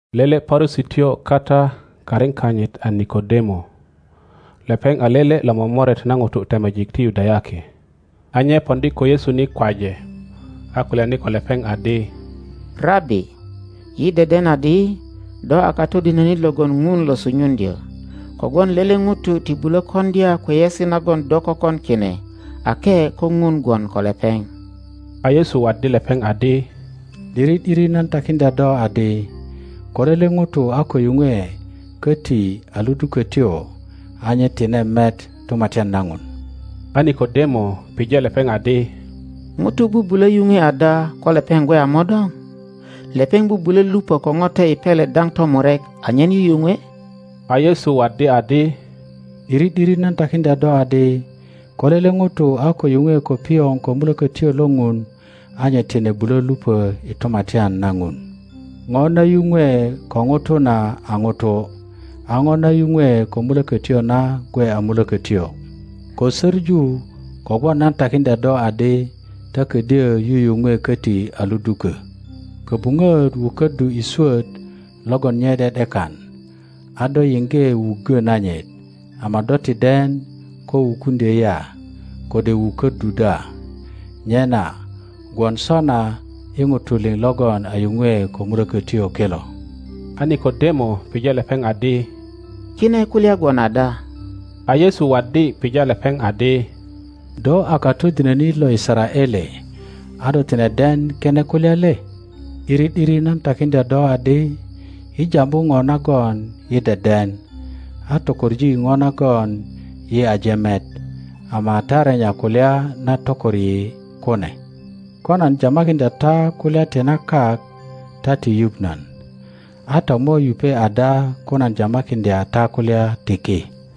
Lele Parusityo kata karin kanyit a Nikodemo, lepeŋ a lele lo momoret na ŋutu temejik ti Yudayaki. A nye poŋdi ko Yesu ni kwaje, a kulyani ko lepeŋ adi, Rabi, yi deden adi do a katodinönit logon Ŋun lo sunyuŋdyö, kogwon lele ŋuto ti bulo koŋdya kweyesi nagon do kökon kine ake ko ŋun gwon ko lepeŋ. A Yesu waddi lepeŋ adi, ’Diri ’diri nan takiŋdya do adi, ko lele ŋuto a ko yuŋwe köti a ludu-kötyo, a nye tine met Tumatyan na Ŋun. A Nikodemo pije lepeŋ adi, Ŋuto bubulö yuŋwe ada ko lepeŋ gwe a mo-doŋ? Lepeŋ bubulö lupö ko Ŋote i pele daŋ tomurek anyen yuyupwe? A Yesu waddi adi, ’Diri ’diri nan takiŋdya do adi, ko lele ŋuto a ko yuŋwe ko pioŋ ko Mulökötyo lo Ŋun, a nye tine bulö lupö i Tumatyan na ŋonaun. Ŋo na yuŋwe ko ŋuto na a ŋuto, a Ŋo na yuŋwe ko Mulökötyo na gwe a mulökötyo. Kosöpu kogwon nan takiŋdya do adi ta ködyö yuyuŋwe köti a ludukö. Köbuŋöt wuköddu i swöt logon nye ’de ’dekan, a do yiŋge wuggö nanyit, ama do ti den ko wukuŋdyö ya, kode wuköddu da, nyena gwon sona i ŋutu liŋ logon a yuŋwe ko Mulökötyo kilo. A Nikodemo pije lepeŋ adi, Kine kulya gwon ada? A Yesu waddi pija lepeŋ adi, Do a katodinönit lo Yisaraele, a do tine den kine kulya le? ’Diri ’diri nan takiŋdya do adi, yi jambu ŋo nagon yi deden, a tokoŋ ŋo nagon yi aje met, ama ta renya kulya na tokor yi kune. Ko nan jamakiŋdya ta kulya ti na kak ta ti yuŋ nan, a ta mo yupe ada ko nan jamakiŋdya ta kulya ti ki?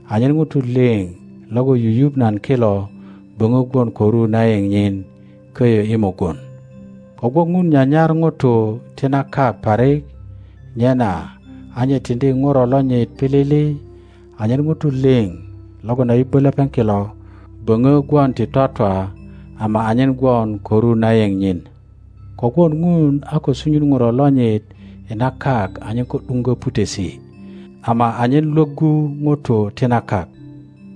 anyen ŋutu liŋ logon yuyuŋ nan kilo böŋö gwon ko ru na yeŋ nyin köyö i mugun. Kogwon Ŋun nyanyar ŋutu ti na kak parik, nyena a nye tiŋdi Ŋuro lonyit pilili anyen ŋutu lio logon a yu-bbö lepeŋ kilo böŋö gwon ti twatwa, ama anyen gwon ko ru na yeŋ nyin. Kogwon Ŋun a ko sunyun Ŋuro lonyit i na kak anyen ko ’duiŋgö putesi, ama anyen lwöggu ŋutu ti na kak.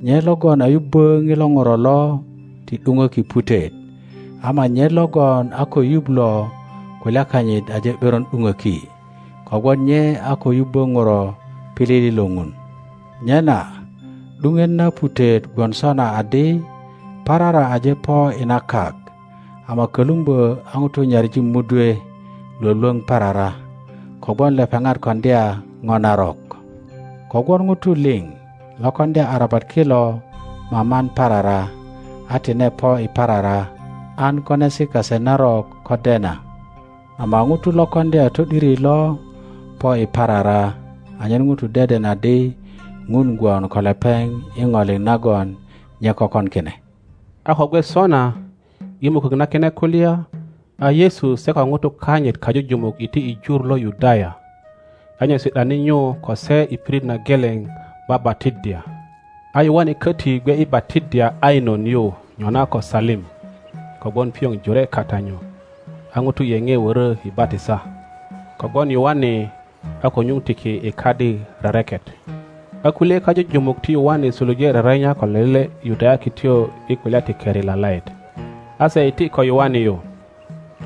Nye logon a yubbö ŋilo Ŋuro lo ti ’duŋöki putet; ama nye logon a ko yuŋ lo kulya kanyit aje ’beron ’duŋöki, kogwon nye a ko yubbö Ŋuro pilili lo Ŋun. Nyena ’duŋet na putet gwon sona adi parara aje po i na kak, ama kölumbö a ŋutu nyaŋi mudwe lwölwöŋ parara, kogwon lepeŋat koŋdya Ŋo narok. Kogwon ŋutu liŋ lo koŋdya arabat kilo maman parara, a tine po i parara, an konesi kase narok ko dena; ama ŋuto lo koŋdya to ’diri lo po i parara, anyen ŋutu deden adi Ŋun gwon ko lepeŋ i ŋo liŋ nagon nye kökon kine. A ko gwe sona, i mukök na kine kulya, a Yesu se ko ŋutu kanyit kajujumuk iti i jur lo Yudaya; a nye si ’dani nyu ko se i pirit na geleŋ babatiddya. A Yoane köti gwe i batiddya Ainon yu nyona ko Salim, kogwon pioŋ jore kata nyu; a ŋutu yeoe wörö i batisa; kogwon Yoane a ko nyuŋ tiki i kadi rereket. A kulye kajujumuk ti Yoane suluje rerenya ko lele Yudayakityo i kulya ti keri lalaet. a se iti ko Yoane yu,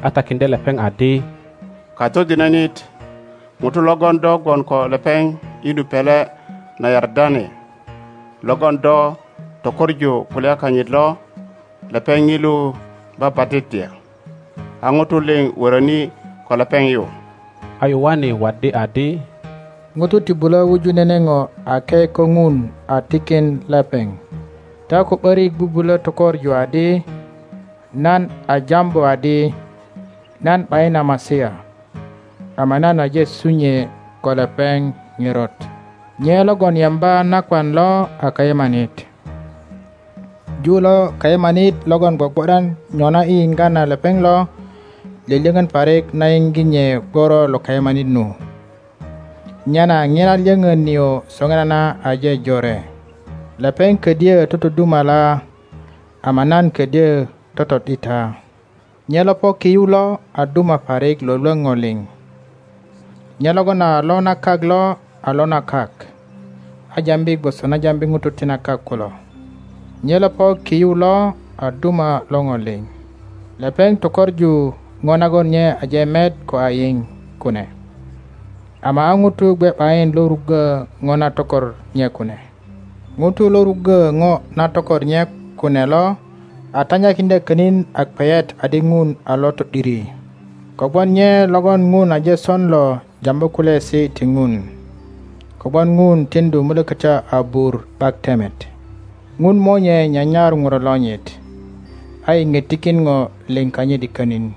a takiŋdye lepeŋ adi, Katodinönit, ŋuto logon do gwon ko lepeŋ i nu pele na Yardene, logon do tökoŋu kulya kanyit lo, lepeŋ ŋilu babatiddya, a ŋutu liŋ wöröni ko lepeŋ yu. a Yoane waddi adi, ŋuto ti bulö wuju nene ŋo ake ko Ŋun a tikin lepeŋ. Ta ko ’börik bubulö tökoŋu adi nan a jambu adi, Nan ’bayin a Masia, ama nan aje sunyue ko lepeŋ ŋerot. Nye logon yemba nakwan lo a kayemanit; ju lo kayemanit logon gwogwo ’dan nyona i yiŋga na lepeŋ lo, lyölyöŋön parik na yiŋge nye gworo lo kayemanit nu. Nyena ŋina lyöŋön nio soŋinana aje jore. Lepeŋ ködyö totodumala ama nan ködyö toto ’dita. Nye lo po ki yu lo a duma parik lwölwöŋ ŋo liŋ. Nye logon a lo na kak lo a lo na kak, a jambi gwoso na jambi ŋutu ti na kak kulo. Nye lo po ki yu lo a duma lo ŋo liŋ. Lepeŋ tökoŋu ŋo nagon nye aje met ko a yiŋ kune, ama a ŋuto gwe ’bayin lo ruggö ŋo na tokor nye kune. Ŋuto lo ruggö ŋo na tokor nye kune lo a tanyakiŋdya könin a kweyet adi Ŋun a lo to ’diri. Kogwon nye logon Ŋun aje son lo jambu kulyaesi ti Ŋun, kogwon Ŋun tiŋdu Mulökötyo abur ’bak temet. Ŋun Monye nya nyar ŋuro lonyit, a iŋge tikin ŋo lio kanyit i könin.